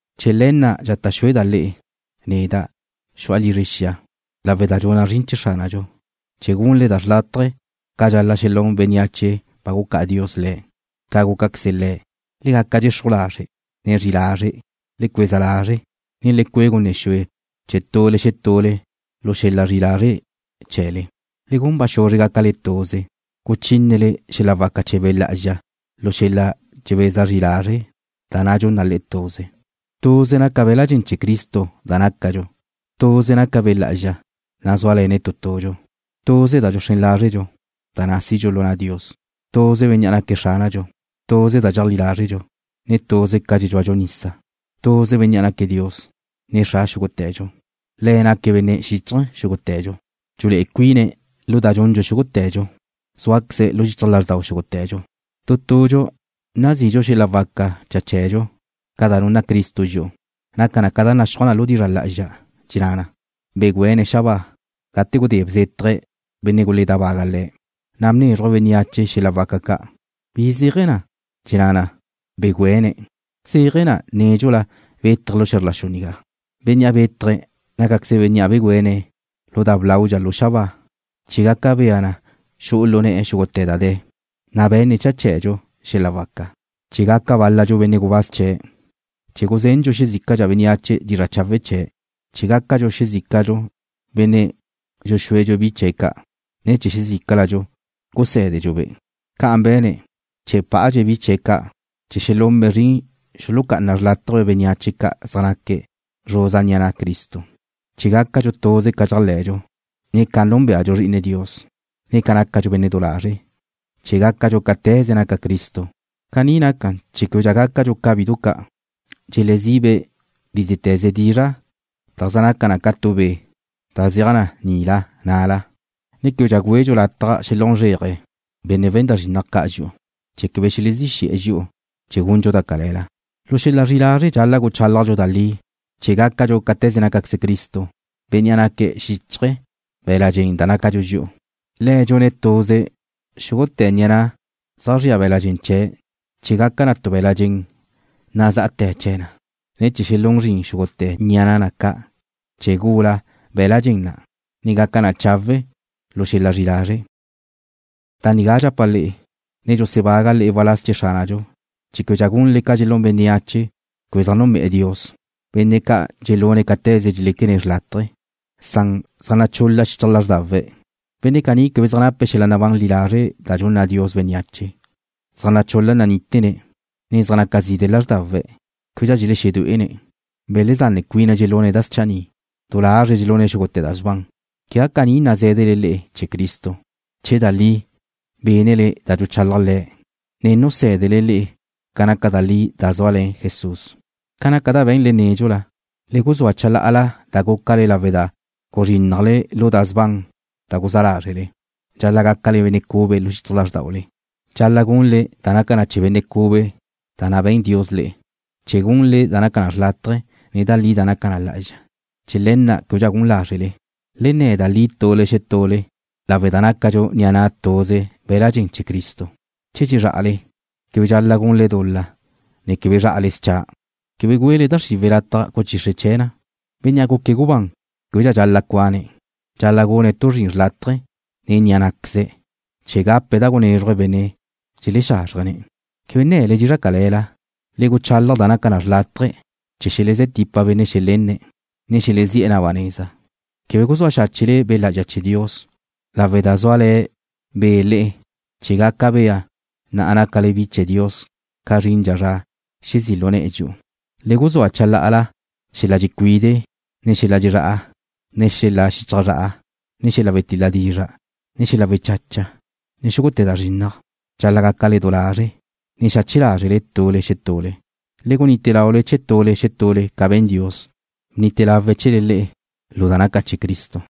Chee̱ le̱ na' dxata' xúeda' le'e, neda', xu'a lizre xia lawe' da dxuna' zrin chee̱ Xránadxu, chee̱ gunle da xrlátaje ca dxal-la' xelún bénneache ba gucá'a Dios le̱', ca gucá'aqueze̱' le'e. Le gaca dxexruj lazre', ne zri'i lazre'. Le cueza lazre', ne le cue' gunne xue chee̱ tule xetule lu xel-la zri'i lazre' chee̱le. Le gun ba xuzre gácaquezle tuze, guchínele xel-la waca chee̱ Be' Lá'azxa lu xel-la dxebeza zri lazre' da na' dxun na le'e tuze. Tuze naca be̱la' dxen chee̱ Cristo da nácadxu. Tuze naca Be' Lá'azxa, Nu na' zúale̱ne' tu tudxu. Tuze da dxuxrén lázredxu, da na' sidxu lu na' Dios. Tuze Bénnea' naque̱' Xránadxu. Tuze da dxeajlí lázredxu. Tuze ca dxedxúadxu nisa. Tuze Bénnea' naque̱' Dios, ne Xra xúgute̱dxu. Le̱' naque̱' Benne' xíchaje̱ xúgute̱dxu. Dxulé'e cuine̱' lu da dxundxu xúgute̱dxu. Zúaqueze̱' lu xichaj lázrdau xúgute̱dxu. Tu tudxu nasidxu tu xel-la waca cha chee̱dxu ca da nunna Cristo dxi'u. Naca na ca naxúaj na lu dizra' lá'azxa, dxenná na: Begüéne̱' xabáa, gate gudé bzétaje̱' benne' guledábague̱' Le̱'. Na' bnézruje̱' bénneache xel-la waca ca'. ¿Bi zéaje̱ na, dxenná na: Begüene̱'? Zéaje̱ na nédxula bétaje̱' lu xe̱zr la xu nigá. Bénnea' bétaje̱' nácaqueze̱' Bénnea' begüéne̱' lu da blaudxa lu xabáa chee̱ gaca bea na xu'u lu ne̱'e̱ xúgute̱ da de̱, na' be̱nne̱' cha chee̱dxu xel-la waca chee̱: Gaca bál-ladxu benne' gubáz chee̱'. Gaca guzendxu xezícadxu bénneache dizra' chawe' chee̱'. Gácadxu xezícadxu benne' dxuxúedxu bi chee̱' ca'. Na' gusé̱dedxu-be' xezícadxu. Ca'an be̱ne̱' chee̱ bpa'adxe̱' bi chee̱' ca' chee̱ xelunbe' zrin xulucá'anabe' xrlátaje bénneache ca' zaj naque̱' zruza ni'a na' Cristo: Chee̱ gácadxu tuze ca dxéajle̱dxu, ne ca núnbeadxu Zri'ine Dios, chee̱ gácadxu benne' du lazre', chee̱ gácadxu cáte̱ze nácaqueze Cristo. Caní nacan chee̱ québedxa gácadxu ca bidu ca', bi ca' dxelezibe' bítete̱ze dizra' da zaj naca na ca tu be' da zeaj na nila na'la, ne québedxa güedxu lataj xelún zréaje benne' we̱n da zrinnaj ca' dxi'u, chee̱ quebe xelezí xe̱'e̱ dxi'u chee̱ gundxu da cale̱la. Lu xel-la zri'i lazre' dxal-la' guchálajdxu da li chee̱ gácadxu cáte̱ze nácaqueze Cristo, Bénnea' naque̱' xichaj be̱l-la' dxen da nácadxu dxi'u. Le̱' dxune̱' tuze xúgute̱ ni'a na' zaj zria be̱l-la' dxen chee̱' chee̱ gaca na tu be̱l-la' dxen nazá'ate̱ chee̱ na, ne chee̱ xelún zrin xúgute̱ ni'a na' ca' chee̱ gula be̱l-la' dxen na', ne gaca na chawe' lu xel-la zri'i lazre'. Da nigá dxapa' le'e, ne dxusebaga' le'e waláz chee̱ Xránadxu chee̱ québedxa gunle ca dxelún bénneache quebe zaj núnbe'e̱ Dios, benne' ca' dxelune̱' cáte̱ze dxeléquene̱' xrlátaje, benne' ca' zaj nachul-la xichaj lázrdawe̱'. Benne' caní quebe zaj nape̱' xel-la nabán li lazre' da dxunna Dios bénneache: Zaj nachul-la nanítene̱', ne zaj naca zide' lázrdawe̱'. Québedxa dxelexedué'ene̱'. Belezanne cuine̱' dxelune̱' da schanni'. Du lazre̱' dxelune̱' xúgute̱ da sban. Quegá caní nazé̱dele le'e chee̱ Cristo, che da li xca' bénnele da dxuchalaj Le̱', ne nusé̱dene̱' le'e ca naca da li da zúale̱ Jesús. Ca naca da be̱nle nédxula, le guzúa chalá'ala da gúcale lawe' da guzrínnajle lu da sban da guzá lázrele. Dxal-la' gácale benne' cube lu xichaj lázrdaule. Dxal-la' gunle da naca chee̱ benne' cube na' da be̱n Dios le'e chee̱ gunle da naca na xlátaje̱, ne da li da naca na lá'azxa. Chee̱ le̱ na' québedxa gun lázrele. Le nne̱ da li tule xetule lawe' da nácadxu ni'a na' tuze be̱l-la' dxen chee̱ Cristo. Che dxezrá'ale, quebe dxal-la' gunle dul-la, ne quebe zrá'ale scha'. Quebe güele da xriwe̱' lataj guchixre chee̱ na le'e. Bénnea' guque̱' gubán québedxa dxal-la' cuane̱'. Dxal-la' gune̱' tu zrin chawe' nen ni'a ná'queze̱' chee̱ gape̱' da gunézruje̱' benne' dxelexázrjene̱'. Quebe nne̱le dizra' cale̱la. Le guchalaj da naca na xrlátaje chee̱ xelezé̱ tipa benne' xelenne̱', ne xelezí'e̱ na ba neza. Quebe guzúa xáchele Be' Lá'azxa chee̱ Dios, lawe' da zúale̱ Be' le'e chee̱ gaca bea na nácale bi chee̱ Dios ca zrindxa zra xezí' lu ne̱'e̱ dxi'u. Le guzúa chalá'ala: Xel-la dxecuide', ne xel-la dxezrá'a, ne xel-la xichaj zra'a, ne xel-la wetil-la dizra', ne xel-la wechacha, ne xúgute̱ da zrinnaj. Dxal-la' gácale du lazre', ne xache lázrele tule xetule, ne gunite laule chee̱ tule xetule ca be̱n Dios, bnite lawe̱' chee̱le le'e lawe' da nácale bi chee̱ Cristo.